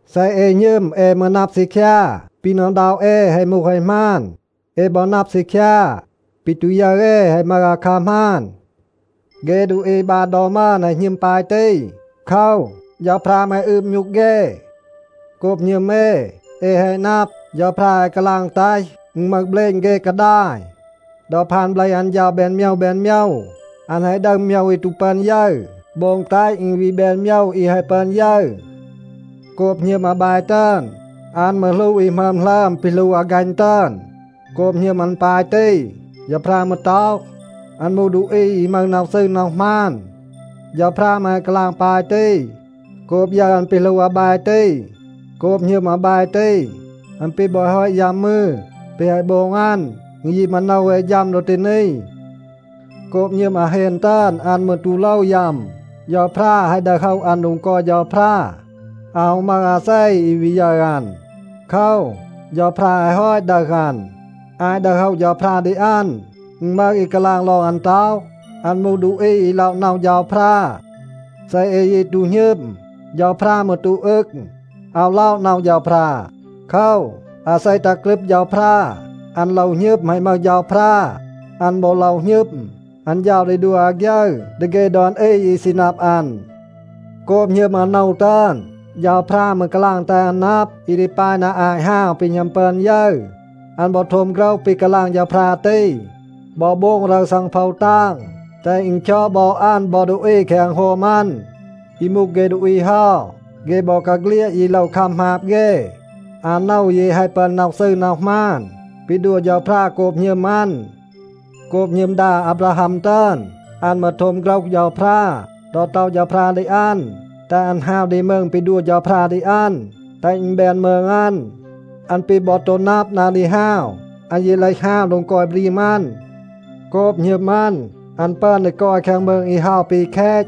เซ เอ หณึม, เอ มืร นับ ซีคยา, ปี หน็อะ อึณด็อะ เอ แฮะ มูห แฮะ หมาน. เอ บอ นับ ซีคยา, ปี ตู ยึร เอ แฮะ มึห อาคัร หมาน. เฆ ดูอี บาน ดอ มึอน แฮะ หณึม ปาย ตี. โคว, เฌาพรา มืร แฮะ อืบ มยูก เฆ. โกบ หณึม เอ, เอ แฮะ นับ, เฌาพรา แฮะ กาลาง แตห อึณ มึห เบลณ เฆ กาดาย. ดอ พาน เบลห อัน เฌา แบน โมยว แบน โมยว, อัน แฮะ ดึห โมยว อี ตู ปึอน ยึร, โบง แตห อึณ วี แบน โมยว อี แฮะ ปึอน ยึร. โกบ หณึม อาแบ ตึอน, อัน มืร หลู อี หมึอม หลึอม ปี หลู อากัณ ตึอน. โกบ หณึม อัน ปาย ตี, เฌาพรา มืร ต็อห, อัน มูห ดูอี อี มึห น็อห ซืร น็อห หมาน. เฌาพรา มืร แฮะ กาลาง ปาย ตี โกบ ยึร อัน ปี หลู อาแบ ตี. โกบ หณึม อาแบ ตี, อัน ปี บอ แฮะ ฮอต ยัม มืร, แปะ แฮะ โบง อัน, อึณ ยี มาโนว เอ ฌัม ดอ ตี นี. โกบ หณึม อาเฮน ตึอน, อัน มืร ตู โลว ยัม. เฌาพรา แฮะ ดึห โฮะ อัน โดง กอย เฌาพรา. อาว ฮู มึห อาเซ อี วี ยึร อัน. โคว, เฌาพรา แฮะ ฮอต ดึห อัน. อาต ดึห โฮะ เฌาพรา ดี อัน, อึณ มึห อี กาลาง ลอง อัน ต็อห, อัน มูห ดูอี อี ล็อะ น็อห เฌาพรา. เซ เอ ยี ตู หณึม, เฌาพรา มืร ตู อึง. อาว ล็อะ น็อห เฌาพรา. โคว, อาเซ ตัห กรึบ เฌาพรา, อัน โลว หณึม, แฮะ มึห เฌาพรา. อัน บอ โลว หณึม, อัน เฌา ดี ดัว อาฆยึร ดี เฆ ดอน อี อี ซี นับ อัน. โกบ หณึม อาโนว ตึอน, เฌาพรา มืร กาลาง แตห อัน นับ อี ดี ปาย นา อาต ฮาว ปี หณัม ปึอน ยึร. อัน บอ โทม โฆรห ปี กาลาง เฌาพรา ตี บอ โบง รึร ซังโพว ตาง, แตห อึณ คยอด บอ อัน บอ ดูอี แคง อึณโฮม อัน. อี มูห เฆ ดูอี เฮา, เฆ บอกาเฆลียด ยี โลว คัม หมาบ เฆ. อาโนว ยี แฮะ ปึอน น็อห ซืร น็อห หมาน ปี ดัว เฌาพรา โกบ หณึม อัน. โกบ หณึม ดา อาบราฮัม ตึอน, อัน มืร โทม โฆรห เฌาพรา ดอ ต็อห เฌาพรา ดี อัน, แตห อัน ฮาว ดี มืง ปี ดี ดัว เฌาพรา ดี อัน, แตห อึณ แบน มืง อัน. อัน ปี บอ ตู นับ นา ดี ฮาว, อัน ยี เลห ฮาว โดง กอย บรีม อัน. โกบ หณึม อัน, อัน ปึอน ดี กอย แคง มืง อี เฮา ปี แคต.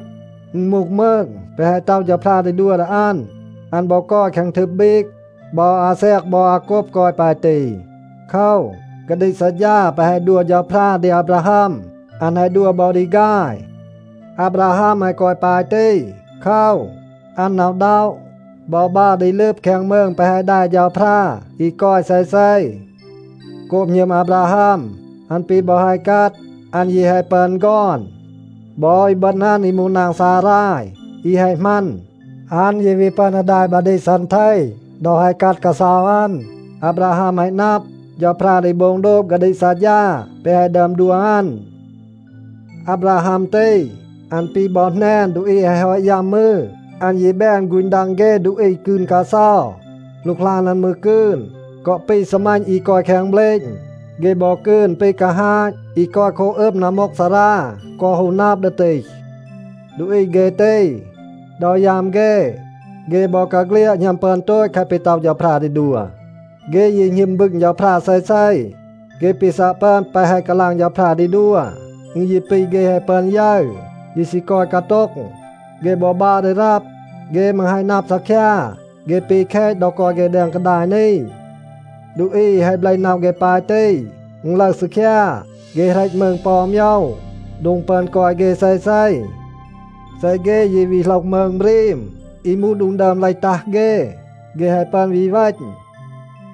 อึณ มูห มืง แปะ แฮะ ต็อห เฌาพรา ดี ดัว ดี อัน. อัน บอ กอย แคง ทึบ บีก. บอ อาแซก บอ อาโกบ กอย ปาย ตี. โคว, กาดีก ซัดฌา แปะ แฮะ ดัว เฌาพรา ดี อาบราฮัม, อัน แฮะ ดัว บอ ดี ฆาย. อาบราฮัม แฮะ กอย ปาย ตี โคว, อัน หน็อะ อึณด็อะ บอ บัร ดี ลึบ แคง มืง แปะ แฮะ แด เฌาพรา, อี กอย เซเซ. โกบ หณึม อาบราฮัม, อัน ปี บอ แฮะ กัด, อัน ยี แฮะ ปึอน ฆอน. บอ อีบึณ อัน อี มูห นาง ซาราย อี แฮะ หมัน, อัน ยี วี ปึอน ดี แด บาดีก ซันเท ดอ แฮะ กัด กาเซา อัน. อาบราฮัม แฮะ นับ, เฌาพรา ดี โบง โดบ กาดีก ซัดฌา แปะ แฮะ ดึอม ดัว อัน. อาบราฮัม ตี, อัน ปี บอ แหนน ดูอี อี แฮะ ฮอต ยัม มืร, อัน ยี แบน ฆูณ ดัง เฆ ดูอี กืน กาเซา. หลูกหลาน อัน มืร กืน กอ ปี ซีมัณ อี กอย แคง เบลณ. เฆ บอ กืน ปี กาฮาต อี กอย โคบ อึม นัมมูกซารา กอ ฮู นับ ดี ตีห. ดูอี เฆ ตี, ดอ ยัม เฆ, เฆ บอกาเฆลียด หณัม ปึอน โตต แคะ ปี ต็อห เฌาพรา ดี ดัว. เฆ ยี หณึม บึง เฌาพรา เซเซ. เฆ ปี ซัะ ปึอน แปะ แฮะ กาลาง เฌาพรา ดี ดัว, อึณ ยี ปี เฆ แฮะ ปึอน ยึร, ยี ซี กอย กาโต็ง. เฆ บอ บัร ดี รับ. เฆ มืร แฮะ นับ ซีคยา, เฆ ปี แคต ดอ กอย เฆ แดง กาดาย นี. ดูอี อี แฮะ เบลห น็อห เฆ ปาย ตี, อึณ ลึห ซีคยา, เฆ เหรต มืง ปอ อู โมยว, โดง ปึอน กอย เฆ เซเซ. เซ เฆ ยี วี โหลห มืง บรีม อี มูห โดง ดึอม เลห ตัห เฆ, เฆ แฮะ ปึอน วี เวณ.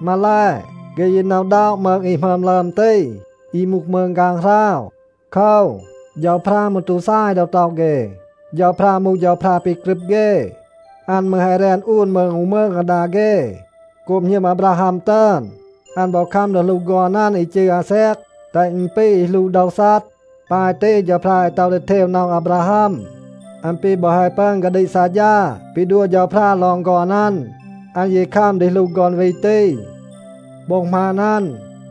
มาแล, เฆ ยี หน็อะ อึณด็อะ มืง อี หมึอม หลึอม ตี, อี มูห มืง ฆางหราว. โคว, เฌาพรา มืร ตู ซาย ดอ ต็อห เฆ, เฌาพรา มูห เฌาพรา ปี กรึบ เฆ. อัน มืร แฮะ แรน อูน มืง อู มืง อาดา เฆ. โกบ หณึม อาบราฮัม ตึอน, อัน บอ คัม ดี หลู ฆอน อัน อี จืร อาแซก, แตห อึณ ปี อี หลู โดว ซัด. ปาย ตี เฌาพรา แฮะ ต็อห ดี เทว น็อห อาบราฮัม. อัน ปี บอ แฮะ ปึอน กาดีก ซัดฌา ปี ดัว เฌาพรา ลอง ฆอน อัน, อัน ยี คัม ดี หลู ฆอน วี ตี. โบ็ง หมาน อัน,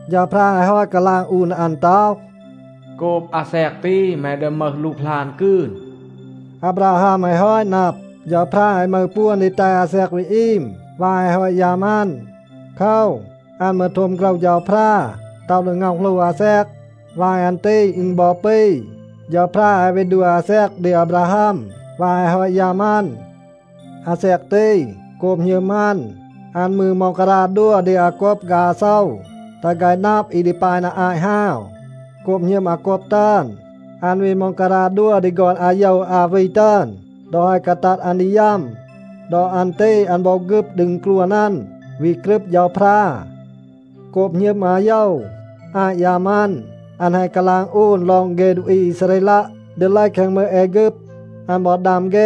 เฌาพรา แฮะ ฮอต กาลาง อูน ดี อัน ต็อห, “โกบ อาแซก ตี, แม ดี มึห หลูกหลาน กืน.” อาบราฮัม แฮะ ฮอต นับ, เฌาพรา แฮะ มึห ปวน ดี แตห อาแซก วี อีม วาย แฮะ ฮอต ยัม อัน. โคว, อัน มืร โทม โฆรห เฌาพรา, ต็อห ดี ง็อห หลู อาแซก. วาย อัน ตี อึณ บอ ปี, เฌาพรา แฮะ วี ดัว อาแซก ดี อาบราฮัม วาย แฮะ ฮอต ยัม อัน. อาแซก ตี, โกบ หณึม อัน, อัน มืร ม็องการา ดัว ดี อาโกบ ฆาย อาโซว, แตห ฆาย นับ อี ดี ปาย นา อาต ฮาว. โกบ หณึม อาโกบ ตึอน, อัน วี ม็องการา ดัว ดี ฆอน อาโยว อา วี ตึอน ดอ แฮะ กาตัด อัน ดี ยัม. ดอ อัน ตี อัน บอ ฆึบ ดี อึณกรวน อัน, วี กรึบ เฌาพรา. โกบ หณึม อาโยว, อาต ยัม อัน, อัน แฮะ กาลาง อูน ลอง เฆ ดูอี อีซาเรลัะ ดี เลห แคง มืง แอฆึบ. อัน บอ ดัม เฆ,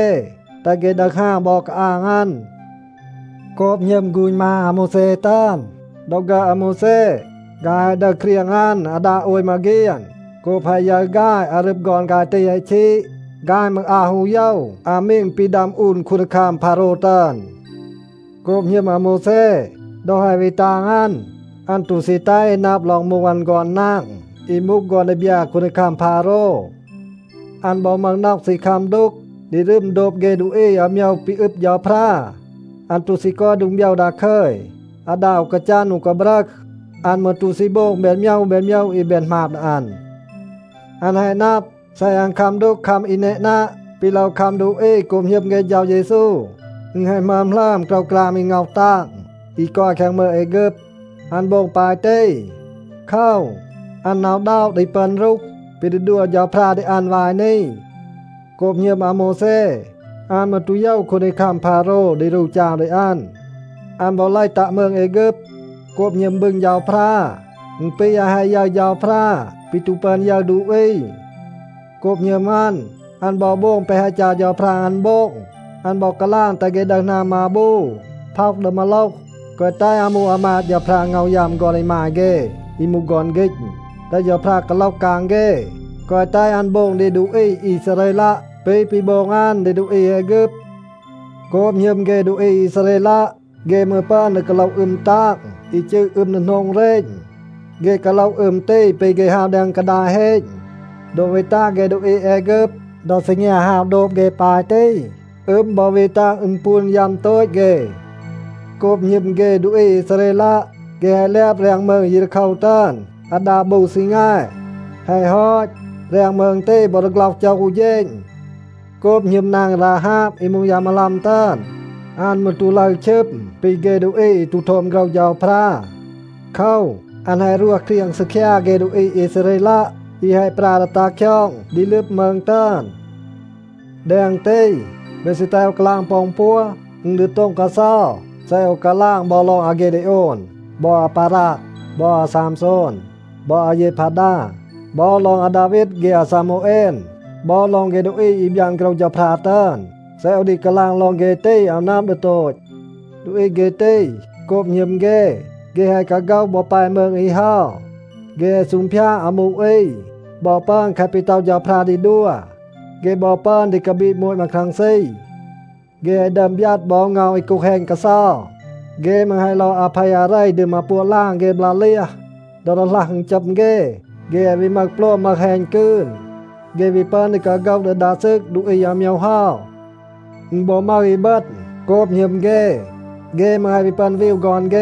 แตห เฆ ดึห ฮาว บอ กาอาง อัน. โกบ หณึม ฆูณ มา อาโมวแซ ตึอน, ดอ ฆึอด อาโมวแซ, ฆาย แฮะ ดึห เครียง อัน อาดา โอย มาเฆียน. โกบ แฮะ ยึร ฆาย, อารึบ ฆอน ฆาย ตี แฮะ ชีด, ฆาย มืร อาว ฮู โยว อามีง ปี ดัม อูน คูนดีคัม พาโรว ตึอน. โกบ หณึม อาโมวแซ, ดอ แฮะ วี ตาง อัน, อัน ตู ซี แตห อี นับ ลอง มูห อัน ฆอน นาง อี มูห ฆอน ดีบยา คูนดีคัม พาโรว. อัน บอ มึห น็อห ซี คัม ดูก ดีรึม โดบ เฆ ดูอี อาโมยว ปี อึบ เฌาพรา. อัน ตู ซี กอย โดง โบยว ดาคึย อาดา อู กาจัน อู กาบรึห. อัน มืร ตู ซี โบง แบน โมยว แบน โมยว อี แบน หมาบ ดี อัน. อัน แฮะ นับ, เซ อัน คัม ดูก คัม อี แนนัะ ปี โลว คัม ดูอี โกบ หณึม เฆ เฌา เยซู, อึณ แฮะ หมึอม หลึอม โกรวกราม อี ง็อห ตาง อี กอย แคง มืง แอฆึบ. อัน โบง ปาย ตี โคว, อัน หน็อะ อึณด็อะ ดี ปึอน รูห ปี ดี ดัว เฌาพรา ดี อัน วาย นี. โกบ หณึม อาโมวแซ, อัน มืร ตู โยว คูนดีคัม พาโรว ดี รู จาว ดี อัน. อัน บอ เลห ตัะ มืง แอฆึบ. โกบ หณึม บึง เฌาพรา, อึณ ปี อัน แฮะ ยึร เฌาพรา ปี ตู ปึอน ยึร ดูอี. โกบ หณึม อัน, อัน บอ โบง แปะ แฮะ จัร เฌาพรา อัน โบง, อัน บอ กาลาง แตห เฆ ดึห หนาม มาบู, พ็อห ดี มา มาโลห, แกวะ แตห อามู อามาด เฌาพรา ง็อห ยัม ฆอน อีมาย เฆ อี มูห ฆอน ฆีณ, แตห เฌาพรา กาโลห กาง เฆ. แกวะ แตห อัน โบง ดี ดูอี อีซาเรลัะ ปี ปี โบง อัน ดี ดูอี แอฆึบ. โกบ หณึม เฆ ดูอี อีซาเรลัะ, เฆ มืร ปึอน ดี กาโลห อึม ตาง อี จืร อึม ดีโหนง เรณ. เฆ กาโลห อึม ตี ปี เฆ ฮาว แดง กาดาย เฮณ. ดอ วี ตัห เฆ ดูอี แอฆึบ, ดอ ซีงยา ฮาว โดบ เฆ ปาย ตี, อึม บอ วี ตัห อึณปูน ยัม โตต เฆ. โกบ หณึม เฆ ดูอี อีซาเรลัะ, เฆ แฮะ แลบ แรง มืง เยรีโคว ตึอน อาดา บู ซีแง. แฮะ ฮอต, แรง มืง ตี บอ ดีฆล็อห โจห อู เฌณ. โกบ หณึม นาง ราฮาบ อี มูห ยา มาลัม ตึอน, อัน มืร ตู ลึร ชึม ปี เฆ ดูอี อี ตู โทม โฆรห เฌาพรา. โคว, อัน แฮะ รวห เครียง ซีคยา เฆ ดูอี อีซาเรลัะ อี แฮะ ปรา ดี ตัห คยอง ดี ลึบ มืง ตึอน. แดง ตี, เบ ซี แตห โอว กาลาง ปอ อึณ ปัว? อึณ ดี โต็ง กาเซา เซ โอว กาลาง บอ ลอง อากีดีโอน, บอ อาบารัก, บอ อาซามโซน, บอ อาเยพาดา, บอ ลอง อาดาวีด เฆ อาซามูเอน, บอ ลอง เฆ ดูอี อี บยาน โฆรห เฌาพรา ตึอน. เซ โอว ดี กาลาง ลอง เฆ ตี, อาว นับ ดี โตต. ดูอี เฆ ตี, โกบ หณึม เฆ, เฆ แฮะ กาโฆห บอ แป มืง อี เฮา. เฆ แฮะ ซูงพยาด อามู อี บอ ปึอน แคะ ปี ต็อห เฌาพรา ดี ดัว. เฆ บอ ปึอน ดี กาบีด โมต มาครังซี. เฆ แฮะ ดึอม บยัด บอ เงา อี กูห แฮณ กาเซา. เฆ มืร แฮะ ลอด อาเพ อาเร ดี มาปัวะ ลาง เฆ บลา เลียห. ดอ ดีหลัห อึณจัม เฆ, เฆ แฮะ วี มึห โปลม มึห แฮณ กืน. เฆ วี ปึอน ดี กาโฆห ดี ดา ซึก ดูอี อาโมยว เฮา. อึณ บอ มึห อีบึณ, โกบ หณึม เฆ, เฆ มืร แฮะ วี ปึอน วีว ฆอน เฆ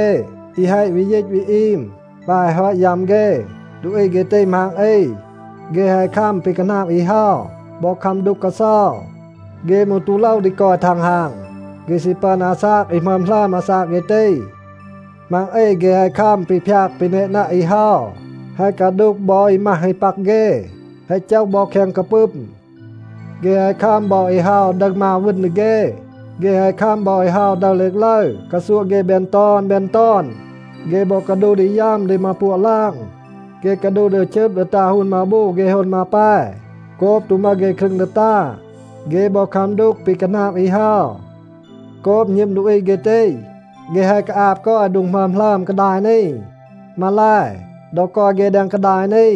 อี แฮะ วี ยีต วี อีม วาย แฮะ ฮอต ยัม เฆ. ดูอี เฆ ตี มัง อี, เฆ แฮะ คัม ปี คาหนาบ อี เฮา บอ คัม ดูก กาเซา. เฆ มืร ตู โลว ดี กอย ทังฮาง. เฆ ซี ปึอน อาซาก อี หมึอม หลึอม อาซาก เฆ ตี. มัง อี เฆ แฮะ คัม ปี พยาก ปี แนนัะ อี เฮา, แฮะ กาดูห บอ อี มัห อี ปัก เฆ, แฮะ โจห บอ แคง กาปึม. เฆ แฮะ คัม บอ อี เฮา ดึห มาว, วึณ ดี เฆ. เฆ แฮะ คัม บอ อี เฮา ดึห เลกลึร, กาซัวะ เฆ แบน ตอน แบน ตอน. เฆ บอ กาดูห ดี ยัม ดี มาปัวะ ลาง. เฆ กาดูห ดี ชึบ ดี ตา ฮูน มาบู เฆ ฮูน มาแป โกบ ตู มึห เฆ ครึง ดี ตา. เฆ บอ คัม ดูก ปี คาหนาบ อี เฮา. โกบ หณึม ดูอี เฆ ตี, เฆ แฮะ กาอาบ กอย โดง หมึอม หลึอม กาดาย นี. มาแล, ดอ กอย เฆ แดง กาดาย นี,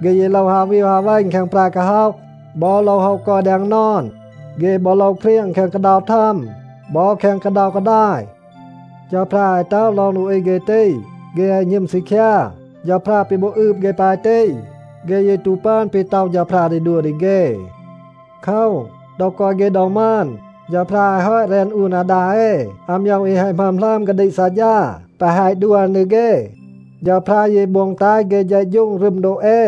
เฆ ยี โลว ฮาว วีว ฮาว เวณ แคง แปร กาฮ็อห, บอ โลว โฮะ กอย แดง นอน. เฆ บอ โลว เครียง แคง กาเดา มาว บอ แคง กาเดา กาดาย. เฌาพรา แฮะ ต็อห ลอง ดูอี เฆ ตี, เฆ แฮะ หณึม ซีคยา. เฌาพรา ปี บอ อืบ เฆ ปาย ตี, เฆ ยี ตู ปึอน ปี ต็อห เฌาพรา ดี ดัว ดี เฆ. โคว, ดอ กอย เฆ ดอ มึอน, เฌาพรา แฮะ ฮอต แรน อูน อาดา เอ อาโมยว อี แฮะ หมึอม หลึอม กาดีก ซัดฌา แปะ แฮะ ดัว อัน ดี เฆ. เฌาพรา ยี โบง แตห เฆ เฌะฌูง รึม โดบ เอ.